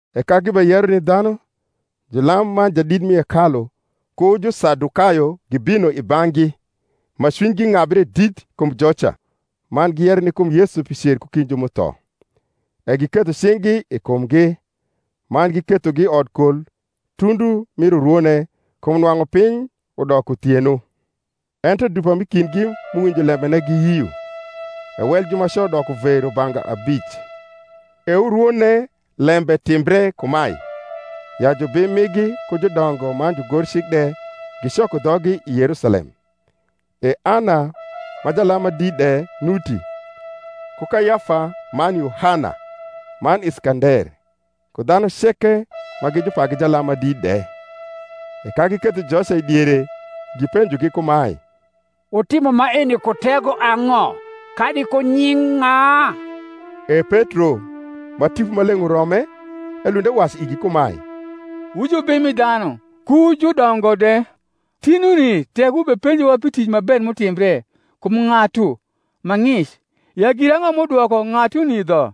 E ka gibeyero ni dhanu, julam man jadit mi hekalu ku Jusadukayo gibino i bang’gi, ma cwinygi ng’abre dit kum joca ponjo dhanu, man giyero ni kum Yesu pi cer ku kind ju m’utho. E giketho cing’gi i kumgi, man gikethogi i odkol tundu mir urwone: kum nwang’u piny udoko uthieno. Ento dupa m’i kindgi m’uwinjo lembene giyio; e wel jumaco doko ve rubanga abic. E urwone lembe timbre kumae, ya jubim migi ku judongo man jugorcik de gicoko dhoggi i Yerusalem; e Ana ma jalam ma dit de nuti, ku Kayafa, man Yohana, man Iskander, ku dhanu ceke ma gi jupagi jalam ma dit de. E ka giketho joca i diere, gipenjo kumae, Wutimo maeni ku tego ang’o, kadi ku nying’ ng’a? E Petro, ma Tipo Maleng’ urome, elund ewacu igi kumae, Wu jubim mi dhanu, ku judongo de, tinuni tek wubepenjowa pi tic ma ber m’utimbre kum ng’atu ma ng’ic, ya girang’o m’udwoko ng’atuni dho;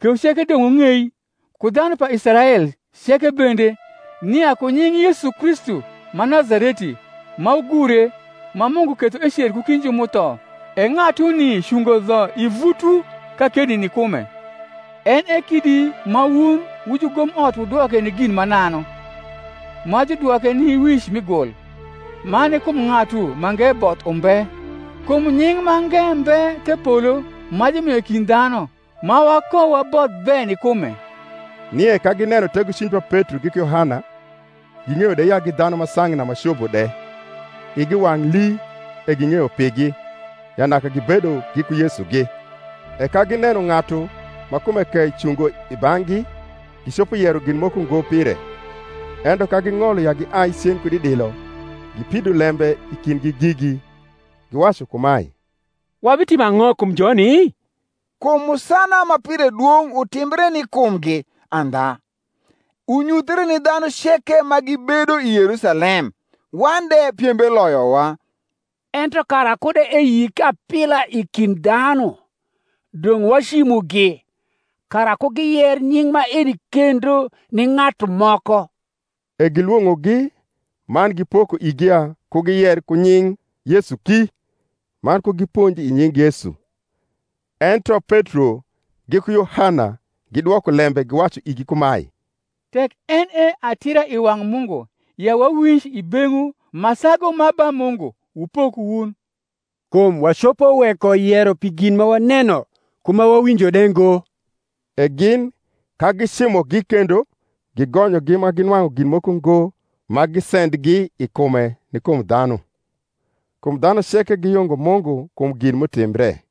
kewu ceke dong’ wung’ei, ku dhanu pa Israel ceke bende, nia ku nying’ Yesu Kristu ma Nazareti, ma wugure, ma Mungu ketho ecer ku kind ju m’utho, e ng’atuni cungo dho i vutwu kakeni ni kume. En e kidi ma wun wu jugomot wudwoke ni gin mananu, ma judwoke ni wic mi gul. Man ni kum ng’atu mange both umbe; kum nying’ mange mbe the polo, ma jumio i kind dhanu, ma wakowaboth be ni kume. Nie ka gineno tegocwiny pa Petro giku Yohana, ging’eyo de ya gi dhanu ma sang’na ma cobo de, igi wang’ lii; e ging’eyo pigi, ya naka gibedo giku Yesugi. E ka gineno ng’atu ma kume kei cungo i bang’gi gicopo yero gin moko ngo pire. Ento ka ging’olo ya giai cen kud i dilo, gipido lembe i kindgi gigi, giwacu kumae, Wabitimo ang’o kum joni? kum musana ma pire dwong’ utimbre ni kumgi andha, unyuthre ni dhanu ceke ma gibedo i Yerusalem; wan de piembe loyowa. Ento kara kud eyik apila i kind dhanu, dong’ wacimugi, kara ku giyer nying’ maeni kendo ni ng’atu moko. E gilwong’ogi, man gipoko igi ya ku giyer ku nying Yesu ki man ku giponj i nying Yesu. Ento Petro giku Yohana gidwoko lembe giwacu igi kumae, Tek en e atira i wang’ Mungu ya wawinj i beng’wu ma sagu ma ba Mungu, wupok wun: kum wacopo weko yero pi gin ma waneno ku ma wawinjo de ngo. E gin, ka gicimogi kendo, gigonyogi ma ginwang’u gin moko ngo ma gisendgi i kume ni kum dhanu; kum dhanu ceke giyungo Mungu kum gin m’utimbre.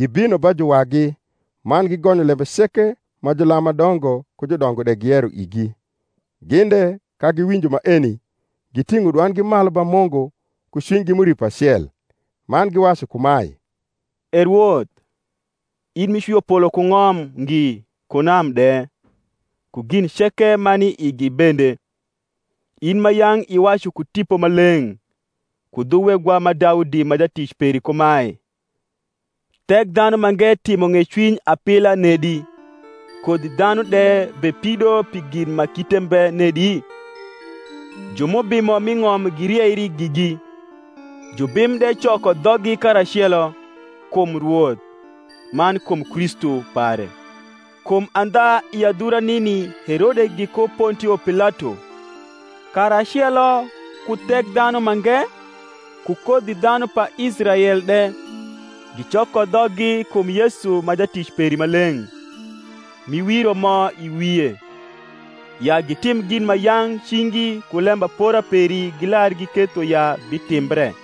E ka jugonyogi, gibino ba juwagi, man gigonyo lembe ceke ma julam ma dongo ku judongo de giyero igi. Gin de, ka giwinjo maeni, giting’o dwandgi malu ba Mungu ku cwinygi m’uripo acel, man giwacu kumae, E Rwoth, in m’icwio polo ku ng’om ngi ku nam de, ku gin ceke ma ni i igi bende: In ma yang’ iwacu ku Tipo Maleng’, ku dhu wegwa ma Daudi ma jatic peri kumae, Thekdhanumange timo ng’ecwiny apila nedi, Kodhi dhanu de bepido pi gin ma kite mbe nedi? Ju m’ubimo m’i ng’om girieri gigi, Jubim de coko dhoggi karacelo, Kum Rwoth, man kum Kristu pare: kum andha i adhura nini Herode giku Pontio Pilato, karacelo ku Thekdhanumange ku kodhi dhanu pa Israel de, gicoko dhoggi kum Yesu ma Jatic peri maleng’, m’iwiro mo i wie, ya gitim gin ma yang’ cingi ku lembapora peri gilar giketho ya bitimbre.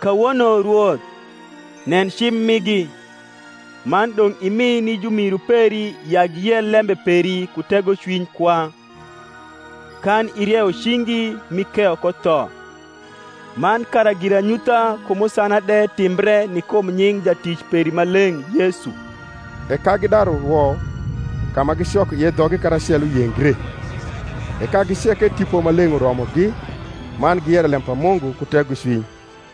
Kawono, Rwoth, nen cim migi: man dong’ imi ni jumiru peri ya giyer lembe peri ku tegocwiny kwa, kan irieyo cingi m’ikeyo ko tho; man kara giranyutha ku musana de timbre ni kum nying’ Jatic peri maleng’ Yesu. E ka gidaru rwo ka ma gicoko ie dhoggi karacelo yengre; e kagi ceke Tipo Maleng’ uromogi, man giyero lem pa Mungu ku tegocwiny.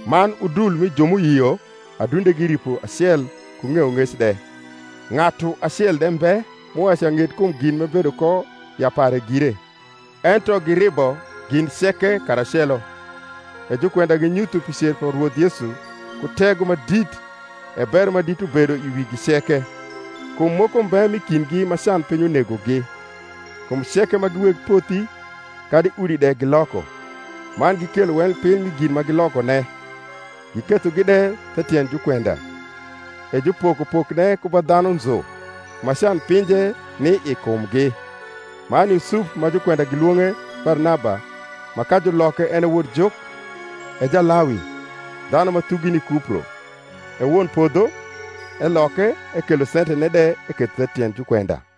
Man udul mi ju m’uyio adundegi ripo acel ku ng’eyong’ec de: ng’atu acel de mbe m’uwacu ya ng’et kum gin m’ebedo ko ya pare gire; ento giribo gin ceke karacelo. E jukwenda ginyutho pi cer pa Rwoth Yesu ku tego ma dit: e bero ma dit ubedo i wigi ceke. Kum moko mbe m’i kindgi ma canpiny unegogi: kum ceke ma gi weg pothi kadi udi de giloko, man gikelo wel piny mi gin ma gilokone, gikethogi de the tiend jukwenda: e jupoko pokne ku ba dhanu nzu, ma can pinje ni i kumgi. Man Yusuf, ma jukwenda gilwong’e Barnaba (ma, ka juloke, en e Wodjuk), e Jalawi, dhanu ma thugi ni Kupro, e won podho, eloke, ekelo sentene de eketho the tiend jukwenda.